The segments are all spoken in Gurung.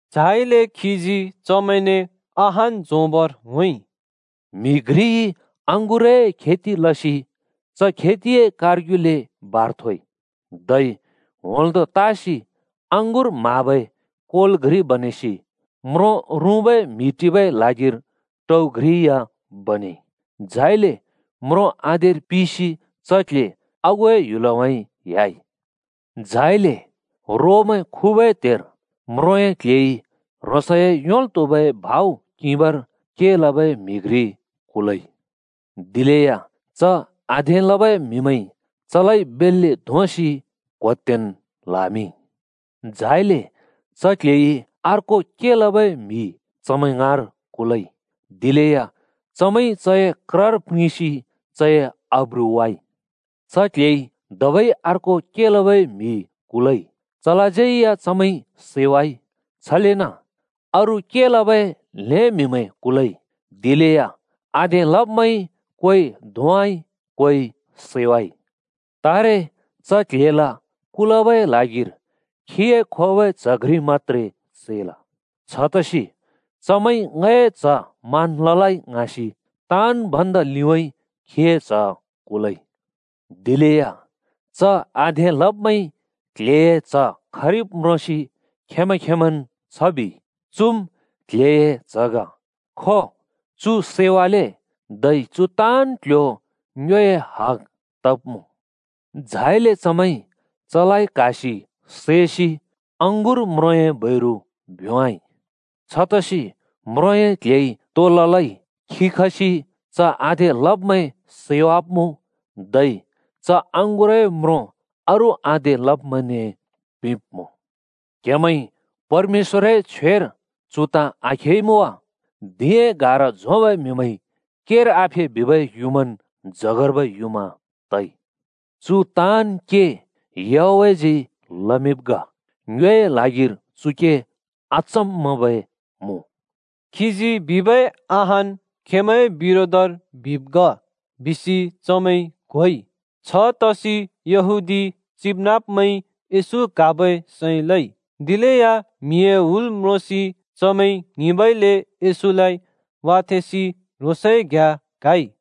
झाइले खीजी चमैंने अहान झोंबर होंइ, “म्‍हि घ्रिइ अँगुरए खेति लसि च खेतिए कारग्युले बार थोइ, धै होंल्दों तासि अँगुर म्हाबै कोल घ्रि बनेसि म्रों रुँबै म्हि टिबै ल्हागिर टउ घ्रि या बनेइ। झाइले म्रों आधेर पिसि च क्‍ल्‍हे आगुए ह्‍युलउँइँ ह्‍याइ। झाइले रोमैं खुबै त्हेर म्रोंए क्‍ल्‍हेइ ह्रोंसए योंल् त्‍हुबै भाउ किंबर के लबै म्हि घ्रि कुलइ। दिलेया च आधे लबै म्‍हिमैंइ चलाइ बेल्‍ले धोंसि क्होत्तेन् ल्‍हामिंइ। झाइले च क्‍ल्‍हेइ अर्को के लबै म्हि चमैं ङाँर कुलइ, दिलेया चमैंइ चए क्रर प्रिंसि चए आब्रु वाइ। च क्‍ल्‍हेइ धबै अर्को के लबै म्हि कुलइ, चलाज्यै या चमैंइ सैवाइ। छलेन अरू के लबै ल्‍हें म्हिमैं कुलइ, दिलेया आधे लब्‍मैंइ कोइ धोंवाइ, कोइ सैवाइ। तारे च क्‍ल्‍हेल कुल‍बै ल्हागिर ह्रोंसइ खोबै च्‍ह घ्रि मत्‍त्रे चैल। छतसि ‘चमैंइ ङए च्‍ह मान् ललै’ ङ्हाँसि ताँन् भन्दा लिउँइँ ह्रोंसए च्‍ह कुलइ। दिलेया च आधे लब्‍मैंइ क्‍ल्‍हेए च्‍ह खरिब् म्रोंसि खेंमैं खेंमैंन् छ बिइ, ‘चुम् क्‍ल्‍हेए च्‍ह ग। खो, चु सैवाले, धै चुए ताँन् क्‍ल्‍ह्‍यो ङ्योए हग तब्‍मुँ।’ झाइले चमैंइ चलाइ क्‍हासि सैसि अँगुर म्रोंए बैरु भ्‍योंवाइ। “छतसि म्रोंए क्‍ल्‍हेइ तो ललै? खी खसि च आधे लब्‍मैं सैवाब्‍मुँ, धै च अँगुरए म्रों अरू आधे लब्‍मैंने पिंब्‍मुँ। क्‍हेमैंइ परमेश्‍वरए छ्वेर चु ताँ आखेइमुँ वा? ‘धिंए गारा झोंबै म्‍हिमैंइ केर आफे बिबै युँमान्, जगर्बै युँमा तइ। चु ताँन् के याहवेहजी लमिंब् ग। ङ्योए ल्हागिर चु के अचम्मबै मुँ।’” खीजी बिबै अहान् खेंमैंए बिरोधर बिब् ग, बिसि चमैंइ क्होइ। छतसि यहूदी चिबनाँब्मैंइ येशू क्‍हाबै सैं लइ। दिलेया म्हिए हुल म्रोंसि चमैं ङ्हिंबइले येशूलाइ वाथेंसि ह्रोंसए घ्‍याँ क्‍हाइ।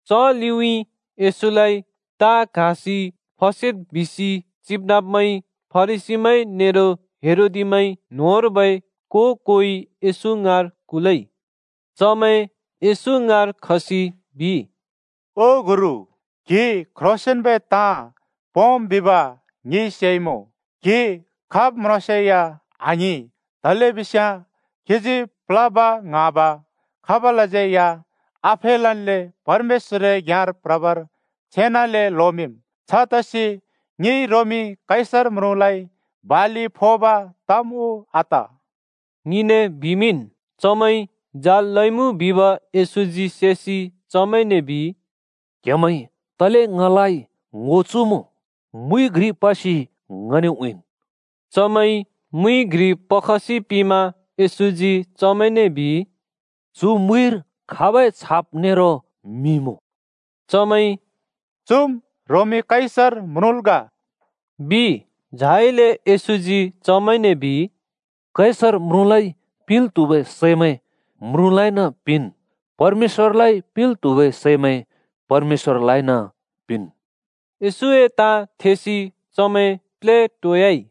च लिउँइँ येशूलाइ ताँ क्‍हासि फसेद् बिसि चिबनाँब्मैंइ फरिसीमैं नेरो हेरोदिमैं न्होंर्बै को-कोइ येशू ङाँर कुलइ। चमैं येशू ङाँर खसि बिइ, “ओ गुरु, क्‍हि क्‍ह्रोंसेंन्बै ताँ पोंम् बिब ङिइ सेइमुँ। क्‍हि खाब् म्रोंसेया आङ्हिं तलेबिस्याँ क्‍हिजी प्लोब, ङ्हाँब, खाबलाज्यै या आफेलल्‍ले परमेश्‍वरए घ्‍याँर प्रबर छेनाले लोमिंम्। छतसि ङिइ रोमी कैसर म्रुँलाइ बालि फोब तम् उ आत?” ङिने बिमिंन्। चमैंइ जाल लइमुँ बिब येशूजी सेसि चमैंने बिइ, “क्‍हेमैंइ तले ङलाइ ङो चुमुँ? मुइ घ्रि पसि ङने उँइँन्।” चमैंइ मुइ घ्रि पखसि पिंमा येशूजी चमैंने बिइ, “चु मुइर खाबै छाप नेरो मिं मुँ?” चमैंइ “चुम् रोमी कैसर म्रुँल् ग,” बिइ। झाइले येशूजी चमैंने बिइ, “कैसर म्रुँलाइ पिंल् त्हुबै सैमैं म्रुँलाइन पिंनुँ, परमेश्‍वरलाइ पिंल् त्हुबै सैमैं परमेश्‍वरलाइन पिंनुँ।” येशूए ताँ थेसि चमैं प्लेटोयाइ।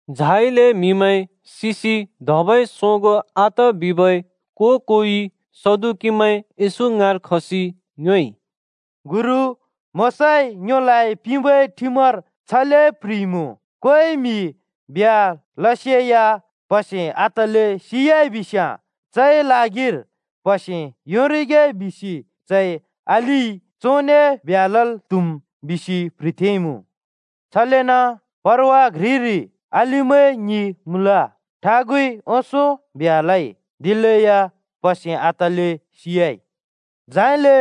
झाइले म्‍हिमैं सिसि धबै सोगों आत बिबै को-कोइ सदुकीमैं येशू ङाँर खसि ङ्योएइ, “गुरु, मोशाइ ङ्योलाइ पिंबै ठिमर छले प्‍ह्रिइमुँ, ‘कोइ म्‍हि ब्ह्‍या लसेया प्‍हसे आतल्‍ले सियाइबिस्‍याँ चए ल्हागिर प्हसे योंरिगे बिसि चए अलिइ चोंने ब्ह्‍या लल् त्हुम्,’ बिसि प्‍ह्रिथेंइमुँ। छलेन परवा घ्रिरि अलिमैं ङि मुँल। ठागुइ ओंसों ब्ह्‍या लइ, दिलेया प्‍हसे आतल्‍ले सियाइ। झाइले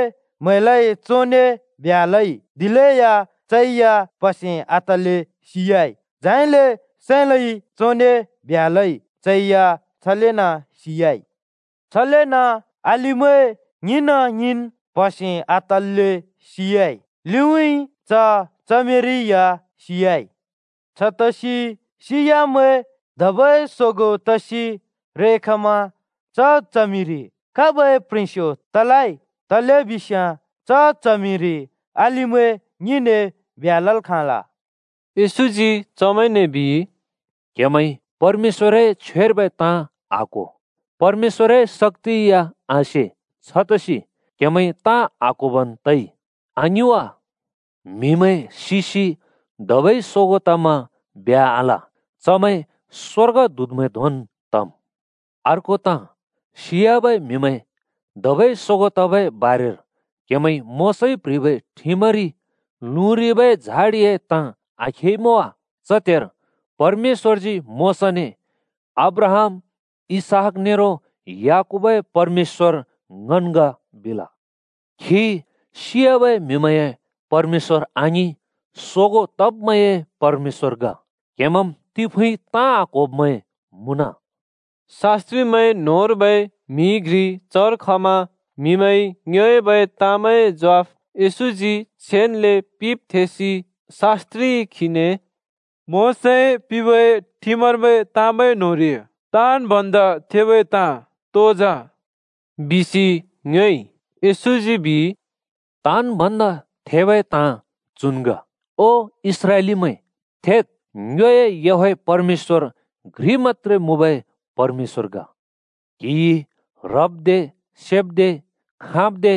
म्हैलइ चोंने ब्ह्‍या लइ, दिलेया चै या प्‍हसे आतल्‍ले सियाइ। झाइले साँइलइ चोंने ब्ह्‍या लइ, चै या छलेन् सियाइ। छलेन अलिमैं ङिन ङिन् प्‍हसे आतल्‍ले सियाइ, लिउँइँ च च्हमिरि या सियाइ। छतसि सियाब्‍मैं धबै सोगों तसि रेखमा च च्हमिरि खाबै प्ह्रेंस्यो तलै? तलेबिस्याँ च च्हमिरि अलिमैं ङिने ब्ह्‍या लल् खाँल।” येशूजी चमैंने बिइ, “क्‍हेमैंइ परमेश्‍वरए छ्वेर्बै ताँ आक्हो, परमेश्‍वरए शक्‍ति या आसे। छतसि क्‍हेमैंइ ताँ आक्होबन् तइ, आङिं वा? म्‍हिमैं सिसि धबै सोगों तमा ब्ह्‍या आल, चमैं स्‍वर्गदूतमैं धोंन् तम्। अर्को ताँ, सियाबै म्हिमैं धबै सोगों तबै बारेर क्‍हेमैंइ मोशाइ प्‍ह्रिबै ठिमरि लुँरिबै झाढिए ताँ आखेइमुँ वा? च त्हेर परमेश्‍वरजी मोशाने ‘अब्राहाम, इसहाक नेरो याकूबए परमेश्‍वर ङन् ग,’ बिल। खी सियाबै म्हि‍मैंए परमेश्‍वर आङिं, सोगों तब्‍मैंए परमेश्‍वर ग। क्‍हेमैंम् तिफुँइ ताँ आक्होब्मैं मुँन।” शास्‍त्रिमैं न्होंर्बै म्हि घ्रि चर खमा म्हिमैंइ ङ्योएबै ताँमैंए ज्वाफ येशूजी छेनले पिंब् थेसि शास्‍त्रिइ खीने “मोशाइ पिंबै ठिमर्बै ताँमैं न्‍होंरि ताँन् भन्दा थेबै ताँ तो जा?” बिसि ङ्योएइ। येशूजी बिइ, “ताँन् भन्दा थेबै ताँ चुन् ग, ‘ओ इस्राएलीमैं थेद्! ङ्योए याहवेह परमेश्‍वर घ्रि मत्‍त्रे मुँबै परमेश्‍वर ग। क्हिइ ह्रब्दे सेब्दे, खाँब्दे,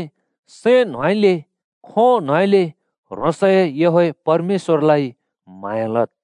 सैं न्होंउँइँले, खों न्होंउँइँले ह्रोंसए याहवेह परमेश्‍वरलाइ म्हाँया लद्।’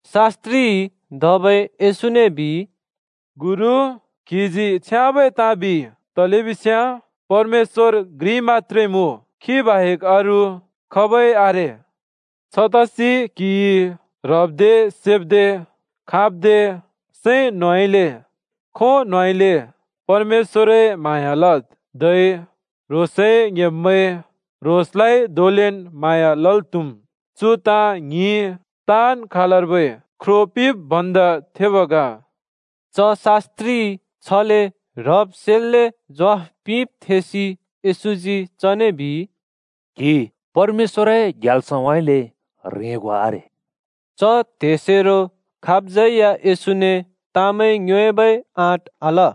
शास्त्रिइ धबै येशूने बिइ, “गुरु, क्‍हिजी छ्याँबै ताँ बिइ, तलेबिस्याँ परमेश्‍वर घ्रि मत्‍त्रे मुँ, खी बाहेक अरू खाबै आरे। छतसि क्हिइ ह्रब्दे सेब्दे, खाँब्दे, सैं न्होंउँइँले, खों न्होंउँइँले परमेश्‍वरए म्हाँया लद्। धै ह्रोंसए ङ्‍हेब्मैं ह्रोंसलाइ धोंलेन् म्हाँया लल् त्‍हुम्। चु ताँ ङ्हिं ताँन् खालर्बै ख्रो पिंब् भन्दा थेब् ग।” च शास्त्रिइ छले ह्रब् सेल्‍ले ज्वाफ पिंब् थेसि येशूजी चने बिइ, “क्‍हि परमेश्‍वरए ग्याल्सउँइँले ह्रेंगो आरे।” च त्हेसेरो खाबज्यै या येशूने ताँमैं ङ्योएबै आँट आल।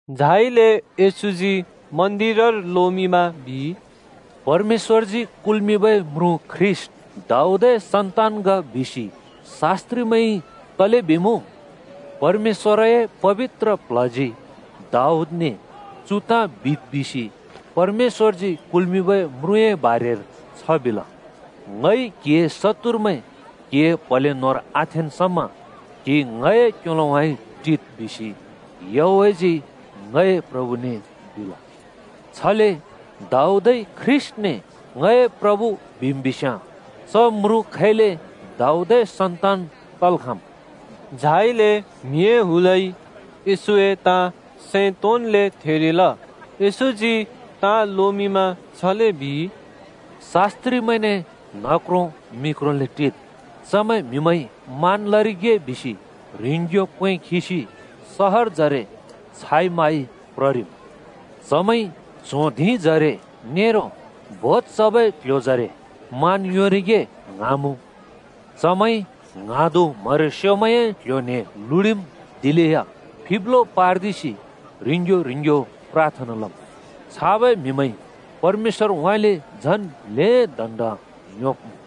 झाइले येशूजी मन्दिरर लोमिंमा बिइ, “‘परमेश्‍वरजी कुल्मिंबै म्रुँ ख्रीष्‍ट दाऊदए सन्‍तान ग,’ बिसि शास्‍त्रिमैंइ तले बिमुँ? परमेश्‍वरए पबित्र प्ल्हजी दाऊदने चु ताँ बिद् बिसि परमेश्‍वरजी कुल्मिंबै म्रुँए बारेर छ बिल, ‘ङइ क्‍हिए शत्तुरमैं क्‍हिए प्‍हले न्‍होंर आथेंन् समा क्‍हि ङए क्‍योलोउँइँ टिद्। बिसि याहवेहजी ङए प्रभुने बिल।’ छले दाऊदइ ख्रीष्‍टने ‘ङए प्रभु’ बिम् बिस्‍याँ च म्रुँ खैले दाऊदए सन्‍तान तल् खाँम्?” झाइले म्हिए हुलइ येशूए ताँ सैं तोंन्‍ले थेरिल। येशूजी ताँ लोमिंमा छले बिइ, “शास्त्रिमैंने न्हक्रों मिक्रोले टिद्। चमैं म्‍हिमैंइ मान् लरिगे बिसि ह्रिंग्‍यो क्‍वें खिसि सहरजरे छाइ माइ प्ररिम्। चमैंइ च्हों धिंजरे नेरो भोज चबै क्‍ल्‍ह्‍योजरे मान् योंरिगे ङ्हाँमुँ। चमैंइ ङ्हाँदु म्हरेस्योमैंए क्‍ल्‍ह्‍यो न्‍हें लुडिम्, दिलेया फिब्लो पार्दिसि ह्रिंग्‍यो ह्रिंग्‍यो प्राथना लम्। छाबै म्हिमैंइ परमेश्‍वरउँइँले झन् ल्‍हें दण्‍ड योंब्‍मुँ।”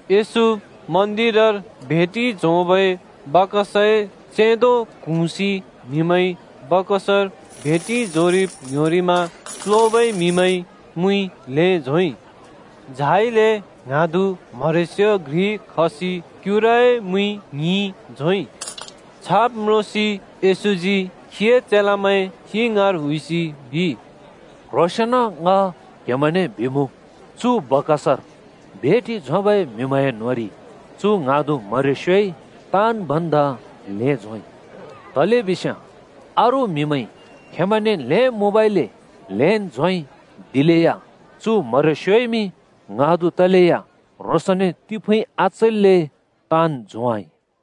येशू मन्दिरर भेटि झोंबै बाकसए चेंदो क्हुँसि म्‍हिमैंइ बाकसर भेटि झोंरिब ङ्‍ह्‍योरिमा प्लोबै म्‍हिमैंइ मुइ ल्‍हें झोंइ। झाइले ङ्हाँदु म्हरेस्यो घ्रि खसि क्युराए मुइ ङ्हिफुँ झोंइ। छाब् म्रोंसि येशूजी खीए चेलामैं खी ङाँर हुइसि बिइ, “क्ह्रोंसेंन ङ क्हेमैंने बिमुँ, चु बाकसर भेटि झोंबै म्‍हिमैंए न्‍होंरि चु ङ्हाँदु म्हरेस्योइ ताँन् भन्दा ल्‍हें झोंइ। तलेबिस्याँ अरू म्‍हिमैंइ खेंमैंने ल्हें मुँबइले ल्हेंन् झोंइ, दिलेया चु म्हरेस्यो ङ्हाँदु तलेया ह्रोंसने तिंफुँइ आचैल्‍ले ताँन् झोंवाइ।”